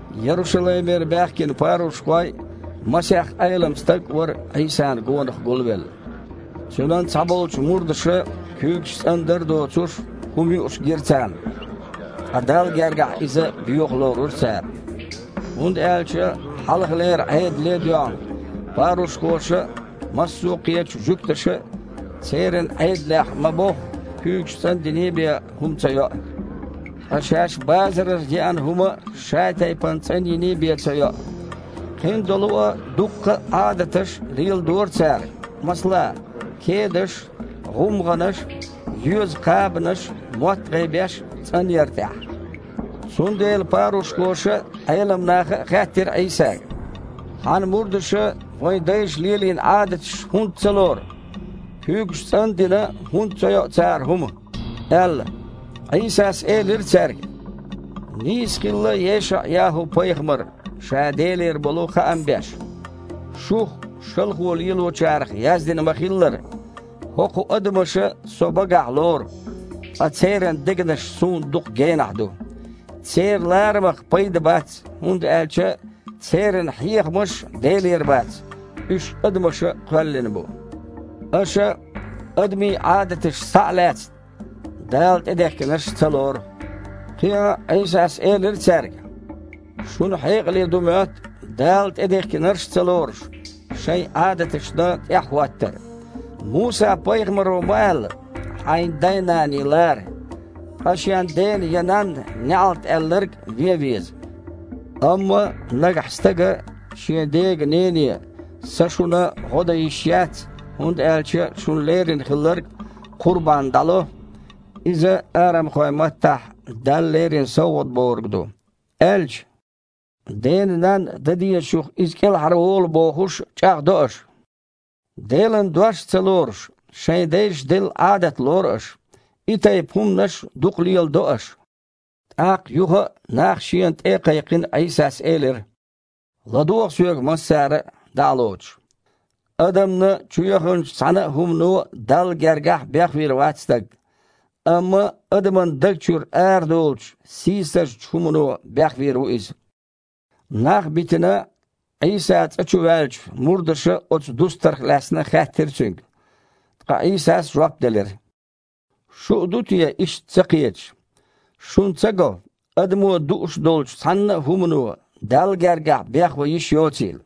Ярушалаймера баьхкина парушхой а, масех Іелам стаг а вара Іийсана гонах гулвелла. Цуьнан цхьаболчу мурдаша, куьйгаш цІандар а доцуш, хІума юуш гира царна. Ткъа Далла гергахь иза боьха лорура цара. ХІунда аьлча, хьалхалера Іедале а доьгІна, парушхоша а, массо а кхечу жуьгташа а, церан Іедалехь ма-бохху, куьйгаш цІандиний бен хІума ца йоу. Ткъа шаьш базарара еана хІума а шатайпана цІанйиний бен ца йоу. Кхин долу а дуккха а Іадаташ леладора цара, масала, кедаш а, гІумгІанаш а, йоьза кхабанаш а, мотт-гІайбеш а цІанъяр тІехь. Цундела парушхоша а, Іелам наха а хаьттира Іийсага: «Хьан мурдаша, вайн дайша лелийна Іадаташ хІунда ца лору, куьйгаш цІан а дина, хІунда ца йоу цара хІума?» – аьлла. Іийсас элира цаьрга: «Нийса хилла ЕшаІ-ЯхІу-пайхамар, ша Делера болу хаам беш. Шух, шалхо лелочарех, яздина ма-хиллара: „ХІокху адамаша Со багахь лору, ткъа церан дегнаш Суна дукха генахь ду. Церан ларамах пайда бац, хІунда аьлча церан хьехамаш Делера бац, уьш адамаша кхоьллина бу“. Аша, адамийн Іадаташ схьа а лаьцна, Дала тІедехкинарш ца лору». Кхин а Іийсас элира цаьрга: «Шуна хьекъале ду моьтту, Дала тІедехкинарш а ца лоруш, шайн Іадаташна тІаьхьахІоттар. Муса-пайхамаро ма аьлла: „Хьайн дай-наний лара“, ткъа „Шен дена я нанна неІалт аьлларг вен веза“. Амма, нагахь стага шен дега-нене: „Сан шуна гІо дан йиш яц, хІунда аьлча шуна лерина хилларг ‘ кхурбан’ дІало“ (иза арамхойн маттахь „Далла лерина совгІат“ бохург ду), – аьлча, дена-нанна дан дезачух иза кІелхьарволу бохуш, чІагІдо аша. Делан Дош а ца лоруш, шайн дайша делла Іадат лору аш. И тайпа хІуманаш дукха леладо аша». ТІаккха юха а, нах Шена тІе а кхайкхина, Іийсас элира: «ЛадогІа Соьга массара а, дІа а лоцуш. Адамна чу яханчу цхьанна а хІумано Далла гергахь бехвийр вац стаг. Амма адаман даг чуьра арадолучу сийсазчу хІумано бехвийр ву иза». Нах а битина, Іийса цІа чу ваьлча, мурдаша оцу дустарх лаьцна хаьттира Цуьнга. Ткъа Іийсас жоп делира: «Шу а ду те иштта ца кхеташ? Шуна ца го, адамо дууш долчу цхьанна а хІумано, Далла гергахь бехван йиш йоцийла?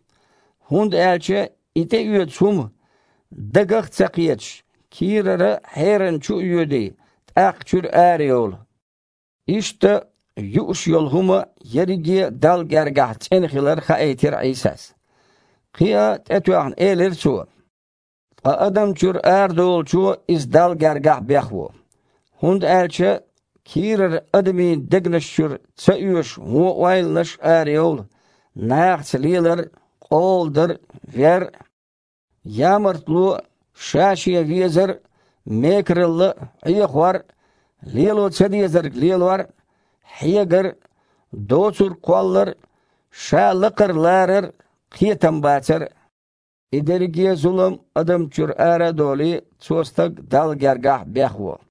ХІунда аьлча и тІеоьцу хІума, дагах а ца кхеташ, кийрара хьерана чу а йоьдий, тІаккха чуьра арайолу». (Иштта, юуш йолу хІума ерриге а Далла гергахь цІена хилар хаийтира Іийсас.) Кхин а тІетоьхна элира Цо: «Ткъа адамна чуьра арадолучо иза Далла гергахь бехво. ХІунда аьлча кийрара адамийн дегнаш чуьра ца оьшу вон ойланаш а арайовлу, нахаца лелар а, къола дар а, вер а, ямартло а, ша-шен везар а, мекаралла а, Іехор а, лело ца дезарг лелор а, хьегар а, доцург кхоллар а, ша лакхара ларар а, кхетам бацар а. И дерриге а зулам адамна чуьра ара а долий, цо стаг Далла гергахь бехво».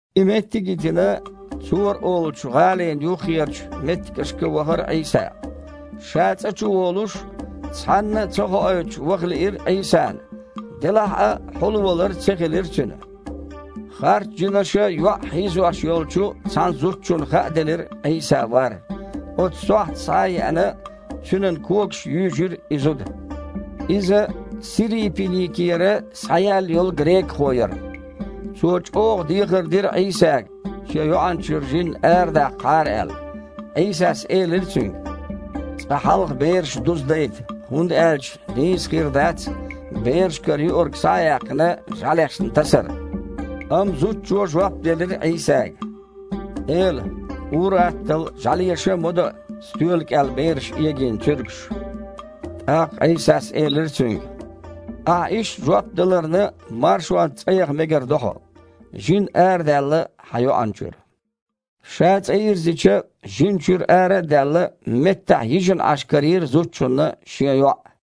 И меттиг а йитина, Цора олучу гІалин юххерчу меттигашка вахара Іийса. Ша цІа чу волуш, цхьанна а ца хоуьйтуш ваха лиира Іийсана, делахь а хьулвалар ца хилира Цуьнан. Харцжинаша йоІ хьийзош йолчу цхьана зудчунна хааделира Іийса вар, оцу сохьта схьа а еана, Цуьнан когашка юьйжира и зуда. Иза Сирийпиникера схьаяьлла йолу грекахо яра. Цо чІогІа дехар дира Іийсага, шен йоІана чуьра жин арадаккхахьара аьлла. Іийсас элира цуьнга: «Цкъа хьалха бераш дузадайта, хІунда аьлча нийса а хир дац берашкара юург, схьа а яьккхина, жІаьлешна тасар». Амма зудчо жоп делира Іийсага: «Эла, ур-атталла жІаьлеша а ма доу стоьла кІел бераша эгийна цуьргаш». ТІаккха Іийсас элира цуьнга: «Ахьа иштта жоп даларна маршонца цІа яха мегар ду хьо. Жин арадаьлла хьан йоІана чуьра». Ша цІа йирзича, жин чуьра ара а даьлла, меттахь йижина Іаш карийра зудчунна шен йоІ.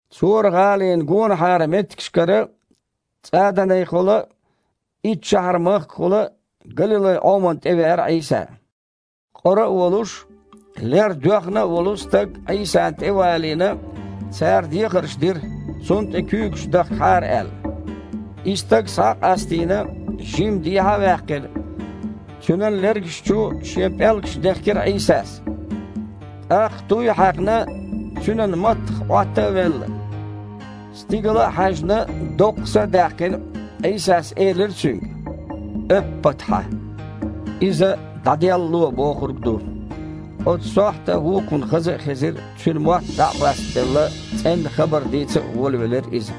Цора-гІалина гонахьара меттигашкара ЦІаданехула а, Иттшахьар-махкахула а Галилай-Іомана тІе веара Іийса. Къора а волуш, лер доьхна а волу стаг Іийсана тІе а валийна, цара дехарш дира, цунна тІе куьйгаш дахкахьара аьлла. И стаг схьа а къастийна, жимма дехьа а ваьккхина, цуьнан лергаш чу Шен пІелгаш дехкира Іийсас. ТІаккха, туй а хьаькхна, цуьнан маттах Іотта а велла, стигала а хьаьжна, доккха са а даьккхина, Іийсас элира цуьнга: «Эппатхьа!» (иза «дІаделлало» бохург ду). Оцу сохьта вукхунна хаза а хезира, цуьнан мотт дІа а бастабелла, цІенна хабар дийца а волавелира иза.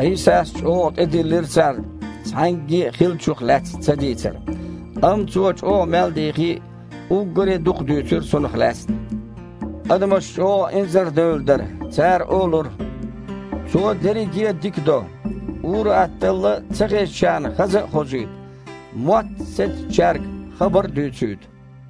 Іийсас чІогІа тІедиллира царна, цхьаьнгге а хиллачух лаьцна цадийцар, амма Цо чІогІа мел дихки а, уггаре а дукха дуьйцура цунах лаьцна. Адамаш чІогІа инзардаьлла дара, цара олура: «Цо дерриге а дика до. Ур-атталла ца хезачарна хаза а хозуьйту, мотт сецначаьрга хабар а дуьйцуьйту».